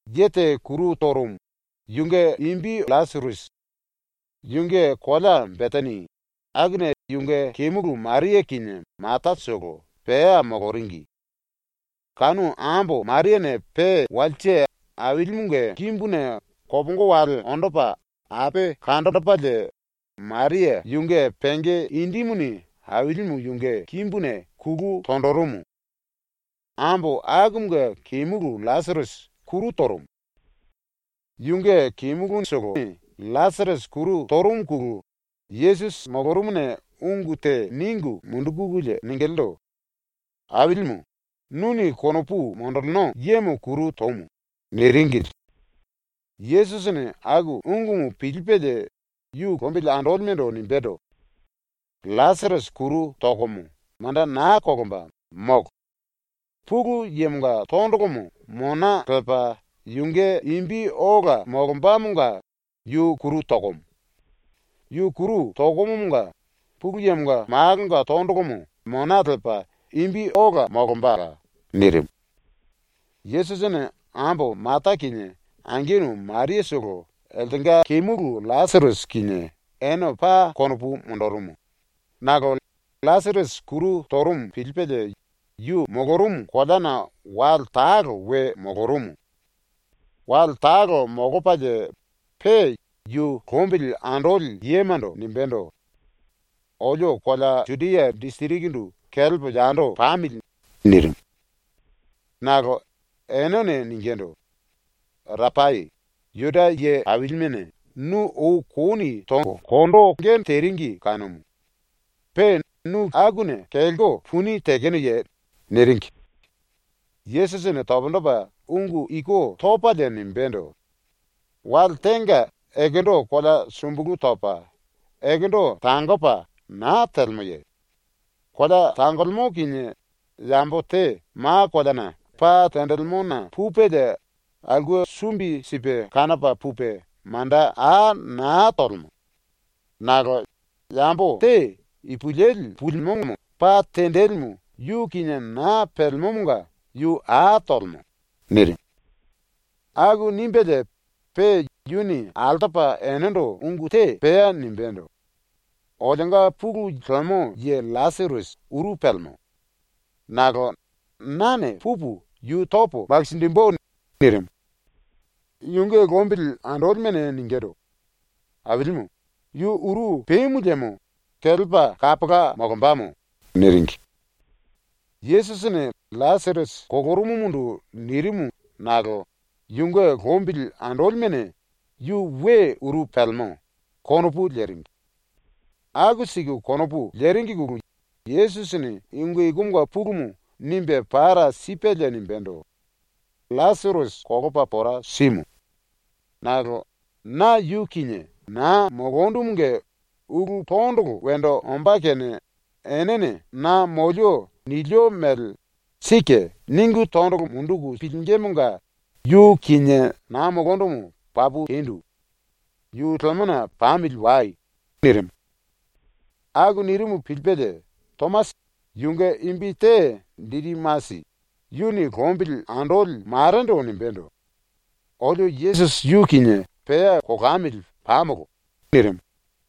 Ye te kuru torumu, yunge imbi LLasirasi. Yunge kolea Betani, akuna yunge kemulu Maria kinie Matatolo pea moloringi. Kanu ambo Mariane pe walse Ailimunge kimbuna kopongo wele ondo lepa ape kanjinjipelie Maria yunge penge indimuni Ailimu yunge kimbuna kulu tonjirimu. Ambo akumunge kemulu LLasirasi kuru torumu. Yunge kemulutolone LLasirasi kuru torumuna Yesusi molorumuna ungu te ningu mundukululie ningilindu: “Ailimu, nuni konopu monjilino yemo kuru tomu.” niringili. Yesusini aku ungumu pilipelie yu lombili andolimendo nimbendo: “LLasirasi kuru tokomomo manda naa kolomba, molo. Pulu Yemonga tondolomo mona lepa yunge imbi ola molombamonga yu kuru tokomo. Yu kuru tokomomonga Pulu Yemonga Malonga tondolomo mona lepa imbi ola molombala.” nirimu. Yesusini ambo Mata kinie angenu Mariatolo eltenga kemulu LLasirasi kinie ene paa konopu monjirimu nakolo LLasirasi kuru torumu pilipelie yu molorumu koleana wale talo we molorumu. Wale talo molopalie pe yu lombili andoli yemando nimbendo: “Olio kolea Judia disirikindu kelepo yando pamili.” nirimu. Nakolo enene ningindu: “Rapai, Juda ye ailimene nu ou kouni tonge teringi kanumu. Pe nu akuna kelko puni tekenoye?” niringi. Yesusini pundu topa ungu iku topalie nimbendo: “Wale tenga ekendo kolea sumbulu topa, ekendo tangopa naa telemoye? Kolea tangolemo kinie yambo te ma koleana pa tenjilimona pupelie aulke sumbi sipe kanopa pupe manda a naa tolemo. Nakolo yambo te ipulueli pulimomo pa tenjilimu yu kinie naa pelemomonga yu a tolemo.” nirimu. Aku nimbelie pe yuni altopa enendo ungu te pea nimbendo: “Olionga pulu lemo ye LLasirasi uru pelemo. Nakolo nane pupu yu topo makinjimbu.” nirimu. Yunge lombili andolimene ningindu: “Ailimu, yu uru pemu liemo kelepa kapola molombamo.” niringi. Yesusini LLasirasi kolorumumundu nirimu nakolo yunge lombili andolimene ‘Yu we uru pelemo.’ konopu leringi. Aku siku konopu leringine Yesusini ungu ikumunge pulumu nimbe para sipelie nimbendo: “LLasirasi kolopa pora simu.” nirimu. “Nakolo na yu kinie naa molondumunge ulu tondolo wendo ombá kene enene na molio nilio mele ‘Sike.’ ningu tondolo munduku pilingímunge yu kinie naa molondumu papu tendu. Yu lemona pamili wai.” nirimu. Aku nirimu pilipelie, Tomasi, yunge imbi te Didimasi, yuni lombili andoli marendo nimbendo: “Olio Yesusi yu kinie pea kolamili pamolo.” nirimu.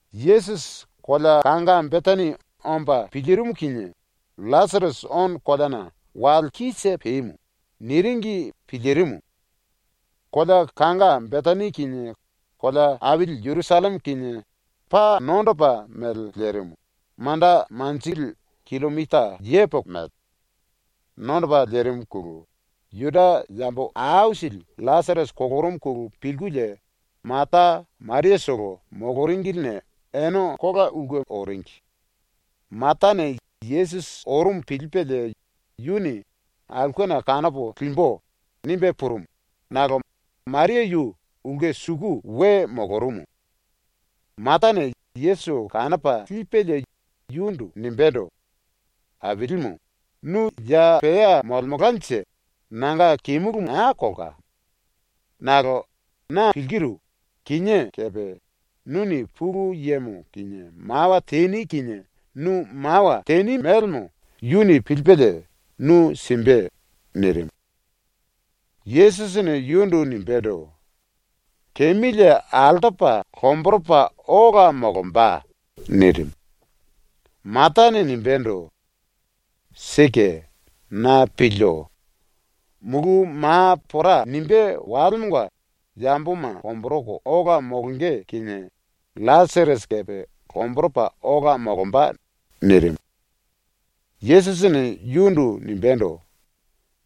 Yesusi kolea kanga Betani omba pilirimu kinie “LLasirasi ono koleana wale kise pemu.” niringi pilirimu. Kolea kanga Betani kinie kolea aili Jerusalleme kinie paa nondopa mele lerimu, manda leli killomita yepoko mele. Nondopa lerimuna Juda yambo aisili LLasirasi kolorumuna pilkulie Mata Mariatolo moloringiline ene kola ulke oringi. Matane Yesusi orumu pilipelie yuni ‘Aulkena kanopo limbu.’ nimbe purumu, nakolo Maria yu ulke suku we molorumu. Matane Yesusi kanopa lipelie yundu nimbendo: “Ailimu, nu ya pea molemelkanje nanga kemulu naa kolka.” nirimu. “Nakolo na pilkiru, kinié kepe nuni Pulu Yemo kinie mawa teni kinie nu mawa teni mélemo yuni pilipelie nu simbe.” nirimu. Yesusini yundu nimbendo: “Kemilie altopa lomboropa ola molomba.” nirimu. Matane nimbendo: “Sike, na pilio. Mulu ma pora nimbe walemonga yamboma lomboroko ola molonge kinie LLasirasi kepe lomboropa ola molomba.” nirimu. Yesusini yundu nimbendo: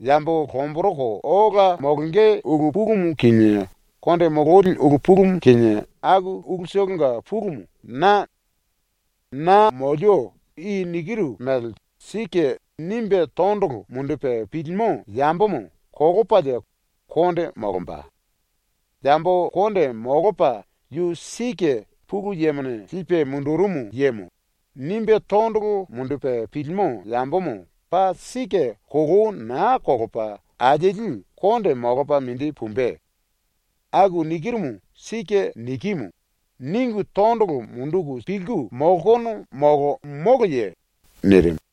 “Yambo lomboroko ola molonge ulu pulumu kinie konde mololi ulu pulumu kinie aku ulutolonga pulumu na.” nirimu. “Na molio i nikiru mele ‘Sike.’ nimbe tondolo mundupe pilimo yambomo kolopalie konde molomba. Yambo konde molopa ‘Yu sike Pulu Yemone lipe mundurumu yemo.’ nimbe tondolo mundupe pilimo yambomo paa sike kolou naa kolopa alieli konde molopa mindi pumbe. Aku nikirumu ‘Sike nikimu.’ ningu tondolo munduku pilku molkono molo moloye?” nirimu.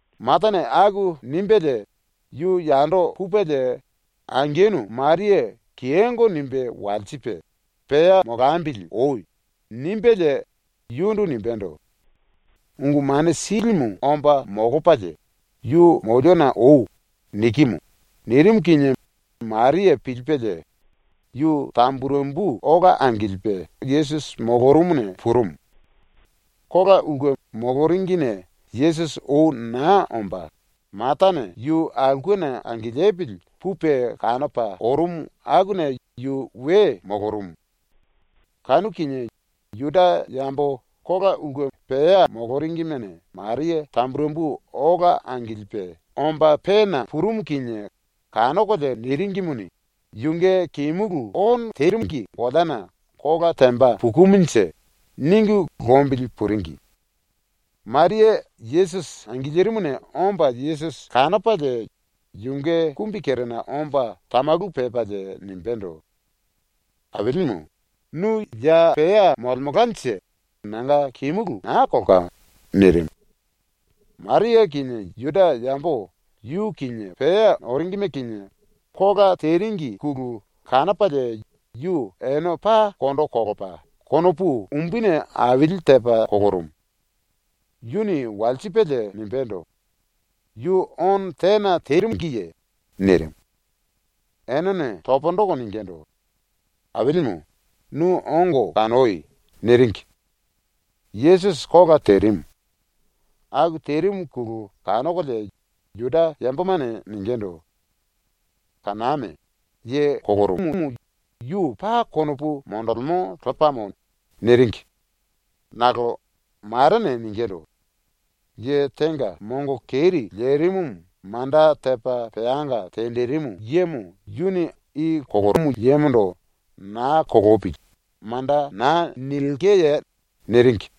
Matane aku nimbelie yu yando pupelie angenu Maria kiyongo nimbe walsipe “Pea molambili oi.” nimbelie yundu nimbendo: “Ungu Mane Silimu omba molopalie, “Yu moliona oi.” nikimu.” nirimu kinie Maria pilipelie yu tamburembu ola angilipe Yesusi molorumuna purumu. Kolaulke moloringine Yesusi ou naa omba, Matane yu aulkena angilipili pupe kanopa orumu akuna yu we molorumu. Kanu kinie Juda yambo kolaulke pea moloringimene Maria tamburembu ola angilipe omba pena purumu kinie kanokolie niringimuni, ‘Yunge kemulu ono tengi koleana kola temba pukumunje.’ ningu lombili puringi. Maria Yesusi angilirimuna omba Yesusi kanopalie yunge kumbikerena omba tamalu pepalie nimbendo: “Ailimu, nu ya pea molemelkanje nanga kemulu naa kolka.” nirimu. Maria kinie Juda yambo yu kinie pea oringime kinie kola teringine kanopalie yu ene paa kondo kolopa konopu umbuni aili tepa kolorumu. Yuni walsipelie nimbendo: “Yu ono tena tengiye?” nirimu. Enene pundu toko ningindu: “Ailimu, nu ongo kanoi.” niringi. Yesusi kola terimu. Aku terimuna kanokolie Juda yambomane ningindu: “Kaname. Ye kolomumu yu paa konopu monjilimo lepamo.” niringi. Nakolo marene ningindu: “Ye tenga mongo keri lerimumu manda tepa peanga tenjirimu yemo yuni i kolomu yemondo “Naa kolopili.” manda naa nilkeye?” niringi.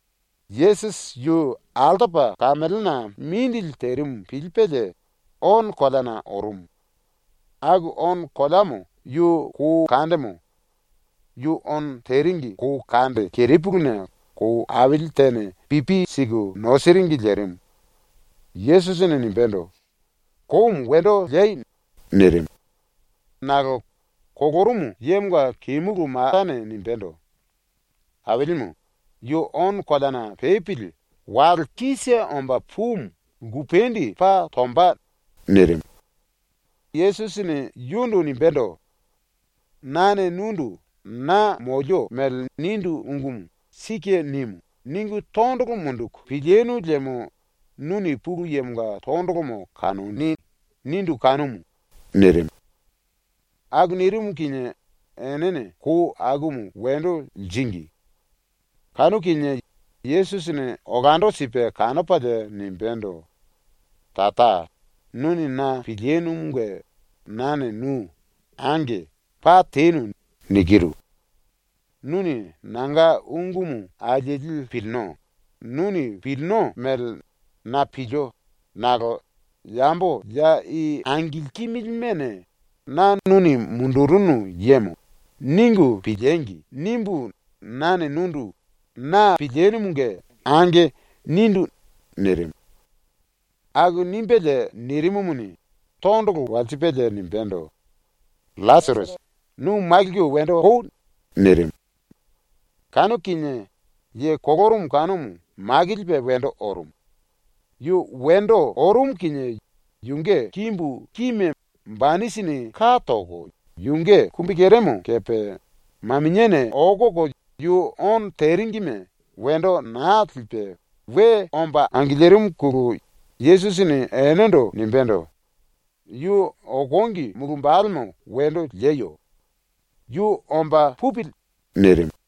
Yesusi yu altopa kamelena mindili terimu pilipelie ono koleana orumu. Aku ono koleamo yu kou kandemo. Yu ono teringi kou kande kerepuluna kou aili tene pipi siku nosiringi lerimu. Yesusini nimbendo: “Koumu wendo liei.” nirimu. Nakolo kolorumu yemonga kemulu Matane nimbendo: “Ailimu, yu ono koleana pepili wale kise omba pumu lkupendi paa tomba.” nirimu. Yesusini yundu nimbendo: “Nane nundu “Na molio mele nindu ungumu ‘Sike nimu.’ ningu tondolo munduku pilinu liemo nuni Pulu Yemonga tondolomo kanoni.” nindu kanumu.” nirimu. Aku nirimu kinie enene kou akumu wendo liringi. Kanu kinie Yesusini olando sipe kanopalie nimbendo: “Tara, nuni na pilinumunge nane nu “Ange. Paa tenu.” nikiru. Nuni nanga ungumu alieli pilino, nuni pilino mele na pilio nakolo ‘Yambo ya i angilkimilimene ‘Na nuni mundurunu yemo.’ ningu piliengi!’ nimbu nane nundu “Na pilinumunge ange.” nindu.” nirimu. Aku nimbelie nirimumuni, tondolo walsipelie nimbendo: “LLasirasi, nu makilku wendo oi.” nirimu. Kanu kinie ye kolorumu kanumu makilipe wendo orumu. Yu wendo orumu kinie yunge kimbu kime banisini ka toko yunge kumbikeremo kepe maminiane okoko yu ono teringime wendo naa lipe we omba angilirimuna Yesusini enendo nimbendo: “Yu okongi mulu wambalemo wendo lieyo. Yu omba pupili.” nirimu.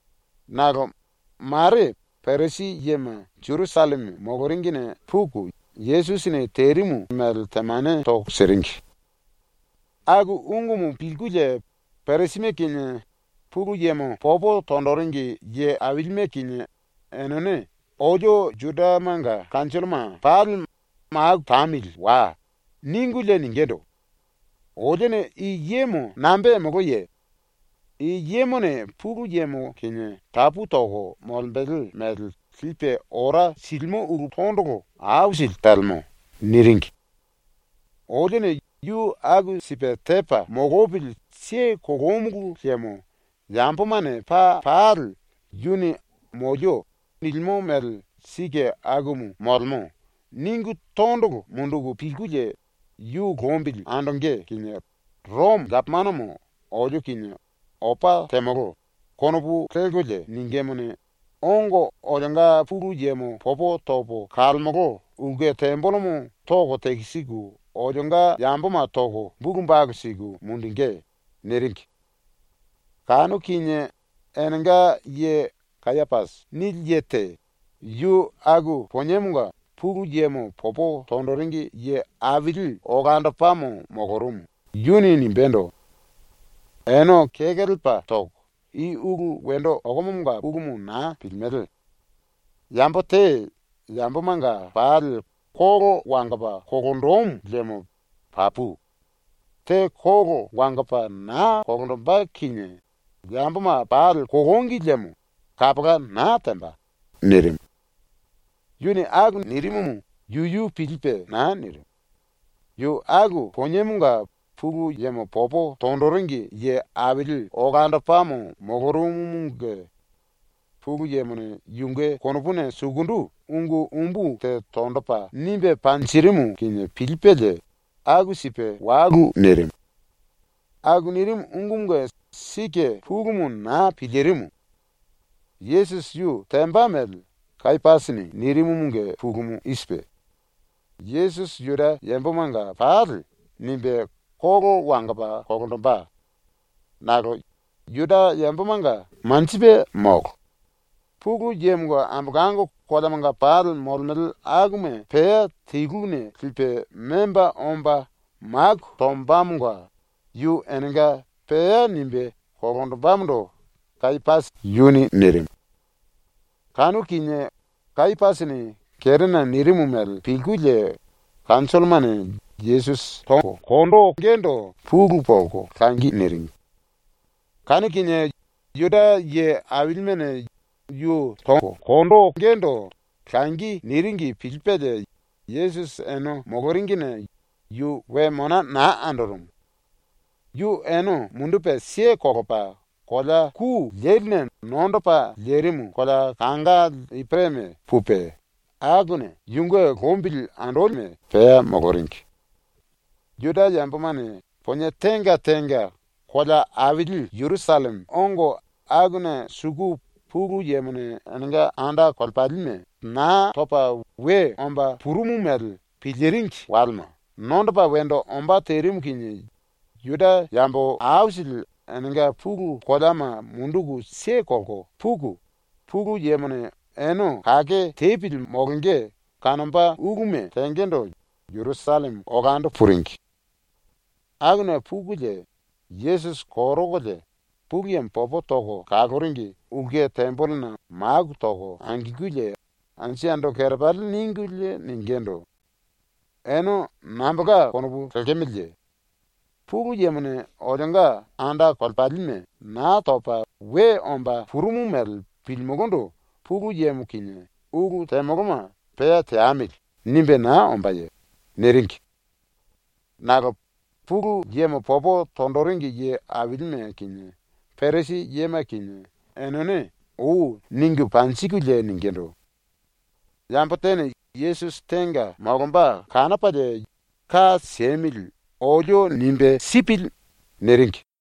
Nakolo mare Parisi yema Jerusalleme moloringine puku Yesusini terimu mele temane toko siringi. Aku ungumu pilkulie Parisime kinie Pulu Yemo popo tonjiringi ye ailime kinie enene “Olio Judamanga kanjolloma pali maku tamili wai.” ningulie ningindu: “Olione i yemo nambe temoloye? I yemone Pulu Yemo kinie tapu toko molembele mele lipe ora silimo ulu tondolo aisili telemo.” niringi. “Olione yu aku sipe tepa molopili siye kolomulu liemo yambomane paa pali ‘Yu molemo nilimo mele sike akumu molemo.’ ningu tondolo munduku pilkulie ⸤yu lombili andonge⸥ kinie Romo gapomanomo olio kinie ‘Opa temolo.’ konopu lelkolie ningímuni, ongo olionga Pulu Yemo popo topo kalemolo ulke tembelemo toko tekisiku olionga yamboma toko bulu balu siku mundungí.” niringi. Kanu kinie enenga ye ‘Kayapasi’ nili ye te, yu aku poniemonga Pulu Yemo popo tonjiringi ye aili olandopamo molorumu, yuni nimbendo: “Ene kekelepa toko, i ulu wendo okomomonga pulumu naa pilimele. Yambo te yambomanga pali kolo wangopa kolonjimu liemo papu. Te kolo wangopa naa kolonjimbe kinie yamboma pali kolongi liemo kapola naa temba.” nirimu. Yuni aku nirimumu yuyu pilipe naa nirimu. Yu aku poniemonga Pulu Yemo popo tonjiringi ye aili olandopamo molorumumunge Pulu Yemone yunge konopuna sukundu ungu umbu te tonjipe nimbe panjirimu kinie pilipelie aku sipe walu nirimu. ⸤Aku nirimu ungumunge sike pulumu naa pilirimu.⸥ Yesusi yu temba mele Kayapasini nirimumunge pulumu i sipe: Yesusi Juda yambomanga pali nimbe kolo wangopa kolonjimbe. Nakolo Juda yambomanga manjipe molo. Pulu Yemonga ambolango koleamanga pali molemele akuma pea teluna lipe memba omba maku tombamonga yu enenga pea nimbe kolonjimbemondo Kayapasi yuni nirimu. Kanu kinie Kayapasini kerena nirimu mele pilkulie kanjollomane Yesusi tongendo pulu monjiku langi niringi. Kanu kinie Juda ye ailimene yu tongendo langi niringi pilipelie Yesusi ene moloringine yu we mona naa andorumu. Yu ene mundupe kelepa kolea ku leline nondopa lerimu kolea kanga Ipereme pupe, akuna yunge lombili andolime pea moloringi. ⸤Juda yambomane ponie tenga tenga kolea aili Jerusalleme ongo akuna suku⸥ Pulu Yemone enenga enda kolepalime Naa Topa We Omba Purumu mele piliringi walema nondopa wendo ombá terimu kinie Juda yambo aisili enenga pulu koleama munduku kelko puku, Pulu Yemone ene kake tepili molonge kanomba uluma tengendo Jerusalleme olando puringi. Akuna pukulie Yesusi korokolie, Pulu Yemo popo toko kaloringi ulke tembelena maku toko angilkulie anju yando kerepali ningulie ningindu: “Ene nambolka konopu lekemeleye? Pulu Yemone olionga anda kolepalime Naa Topa We Omba Purumu mele pilimulundu Pulu Yemo kinie ulu temoloma ‘pea teamili.’ nimbe naa ombáye?” niringi. Nakolo Pulu Yemo popo tonjiringi ye ailime kinie Parisi yema kinie enene ou ningu panjikulie ningindu: “Yambo tene Yesusi tenga molomba kanopalie, ka siemili olio nimbe sipili.” niringi.